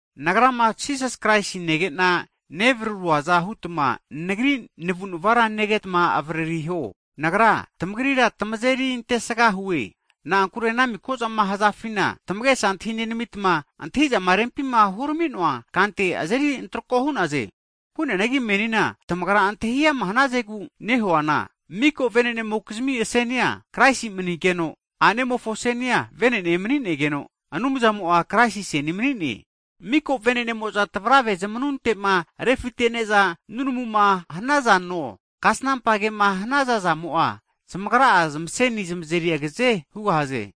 Nagrama Jisas Kraisi nege'na nevararuaza hutma nagri navu'nava negeta avaririho. Nagra tamagrira tamazeri antesgahue. Na'ankure ana miko'zama hazafima tamage'sa antahi nenamitma, antahi'zama rempima huramino'a kante azeri antroko hu'naze. Hu'neanagi menina tamagrama antahiama hanazegu'ma nehuana, mika vene'nemokizmi aseni'a Kraisi manigeno, a'nemofo asenia vene'ne manigeno, Anumzamo'a, Kraisina aseni'a mani'ne. Hagi mika vene'nemo'za tavrave zmanunte'ma refitene'za nunamuma hanazano, kasnampa kema hanaza zamo'a zamagra'a zamasenia zamazeri agaze hugahaze.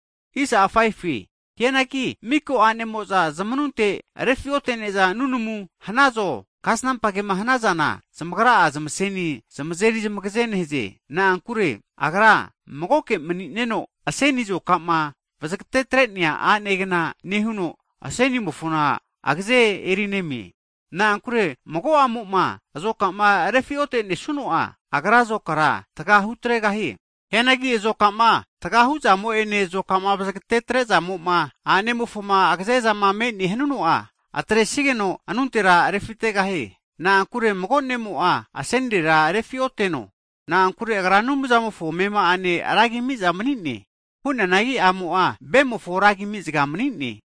Hianagi mika a'nemo'za zmanunte refi'otene'za nunamu hanazo, kasnampa kema hanazana zamagra'a, zamaseni zamazeri zamagaze nehaze. Na'ankure agra magoke mani'neno, aseni azoka'ma vazagatetre'nea a'negna nehuno, asenimofona agaze erinemie. Na'ankure mago a'mo'ma azoka'ma refi'otesuno'a, agra azokara taga hutregahie. Hianagi azoka'ma tagahu zamo'ene, azoka'ma vazagate'zamo'ma a'nemofona agaze'za me'ne hanuno'a, atresageno anuntera refitegahie. Na'ankure mago ne'mo'a asenirera refi'oteno, agra Anumzamofo amema'ane ragi ami vahe mani'ne, hu'neanagi a'mo'a ve'mofo ragi vahe mani'ne.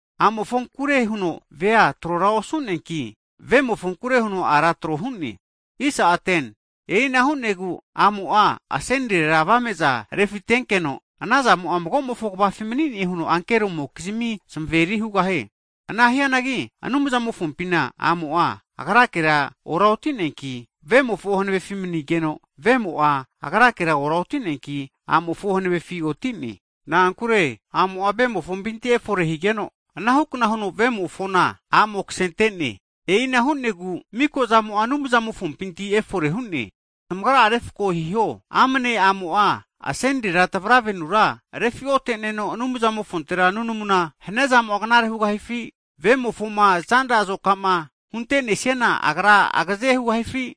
A'mofonkure huno vea trora osu'neanki, vemofonku huno a'ra tro hu'ne. E'ina hu'negu a'mo'a asenirera avame'za refitenkeno, anazamo'a mago'mofo kvafi mani'ne huno ankeromokizmi zmaveri hugahie. Ana hianagi, Anumzamofompina a'mo'a, agra'akera oraoti'neanki, vemofo hanavefi manigeno, vemo'a agrakera oraoti'neanki a'mofo hanavefi oti'ne. Na'ankure a'mo'a vahe'mofompinti efore higeno, anahukna huno vemofona a'mo kasenente. E'ina hu'negu, mika'zamo'a Anumzamofompinti efore hu'ne. Tamagra'a refko hiho, amne a'mo'a asenirera tvaravenura refiote'neno Anumzamofontera nunamuma haniazamo'a knare hugahifi? Vemofoma zanra azoka'ma hunte'nesiana agra agaze hugahifi?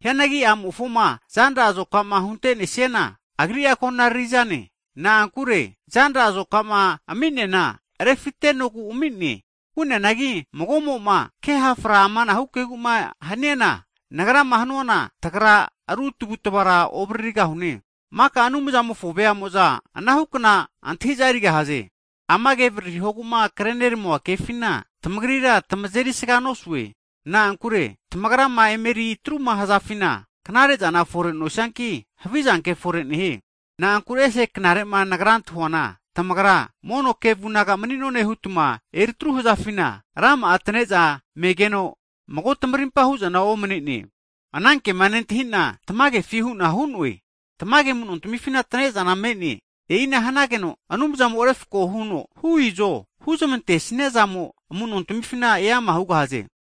Hianagi a'mofoma zanra azoka'ma hunte'nesiana agri'a konaririzane. Na'ankure, zanra azoka'ma ami'neana, refitentenogu ami'ne. Hu'neanagi mago'mo'ma ke hafra amana kegu'ma haniana, nagrama hanuana, tagra ru tavutva ovaririgahune. Maka Anumzamofo veamo'za anahukna antahi'za erigahaze. Ama kema avariri hogu'ma kreneramua kefina, tamagrira tamazeri sganosue, na'ankure tamagrama emeri atruma hazafina, knare'zana fore nosianki, havizanke fore nehie. Na'ankure ese knare'ma nagrama antahi'noana, tamagra mono kevunaga mani'none hutma etru hazafina, rama'a atane'za megeno mago tamarimpa hu'zana omane'ne. Anankema nentahi'na tamagefi hu'na hu'noe. Tamage amu'no tamifina atane'zana me'ne. E'ina hanageno Anumzamo refko huno hu izo huzmante'nesamo'za amu'nontamifina eama hugahaze.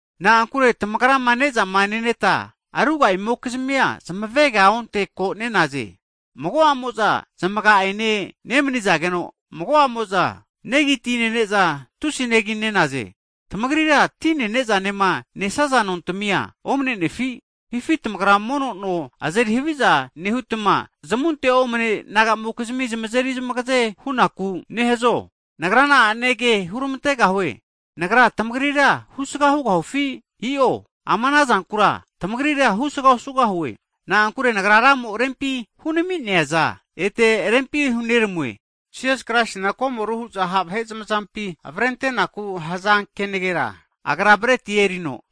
Na'ankure tamagrama ne'zama neneta ruga'amokizmigura zamavegaonte ko nenaze. Mago a'mo'za zamaga'ene nemanizageno, mago'amo'za negi ti nene'za tusi neginenaze. Tamagrira tine ne'zanema nesaza nontamia omne'nefi? Hifi tamagra mono no azeri haviza nehutma, zamunte omne nagamokizmi zamazeri zmagaze hu'naku nehazo? Nagra na'ane ke hurmantegahue? Nagra tamagrira husga hugahufi? I'o. Ama ana zankura tamagrira husga osugahue. Na'ankure nagrira Ramo rempi hunami'neaza, ete rempi huneramue. Jisas Kraisina komoru hu'za ha' vahe zamazampima avrentenaku haza kenagera, Agra breti erino,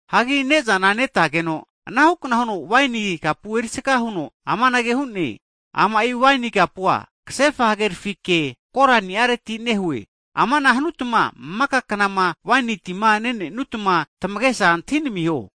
Hagi ne'zana netageno, anahukna huno waini kapu erisaga huno amanage hu'ne. Ama'i waini kapua, kasefa hagerafi ke koraniareti nehue, amana hutma maka knama waini tima nenenutma tamagesa antahinamiho.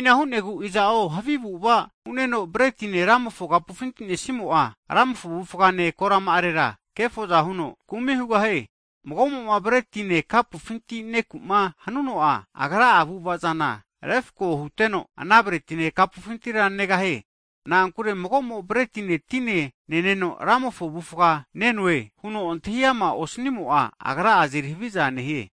E'ina hu'negu iza'o havi avu'ava hu'neno, bretine Ramofo kapufinti nesimo'a, Ramofo avufgafine korama'arera kefoza huno, kumi hugahie. Mago'mo'ma bretine, kapufinti neku'ma hanuno'a, agra'a avu'ava'zana refko huteno, ana bretine kapufintira negahie. Na'ankure mago'mo bretine tine neneno, Ramofo avufga, nenoe huno antahi ama osnimo'a, agra'a azeri haviza nehie.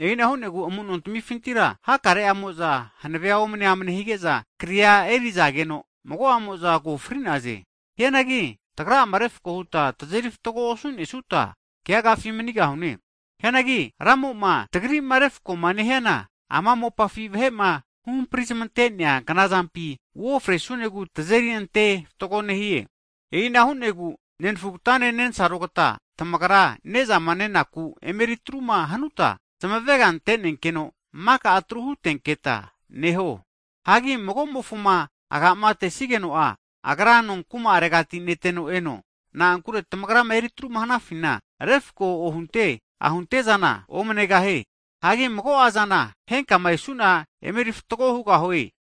E'ina hu'negu, amu'no tamifintira hakare'amo'za hanavea omne amne hige'za, kria erizageno mago'amo'za ko fri'naze. Hianagi tagra'ama refko huta tazeri fatgo osu'nesuta, keagafi manigahune. Hianagi Ramo'ma tagri'ma refko'ma nehiana, ama mopafi vahe'ma huhampri zmante'nea knazampina uofresunegu tazeri ante fatgo nehie. E'ina hu'negu, nenfugata nensarogata tamagra mono ne'zama nenaku'ma emeri atruma hanuta, zamavega ante'nenkeno maka etru hutenketa neho. Hagi mago'mofoma agamatesigeno'a, agra nonkuma'arega neteno eno. Na'ankure tamagrama etruma hanafina, refko ohunte ahunte zana omnegahie. Hagi mago'azana, henkama esu'na emeri fatgo hugahue.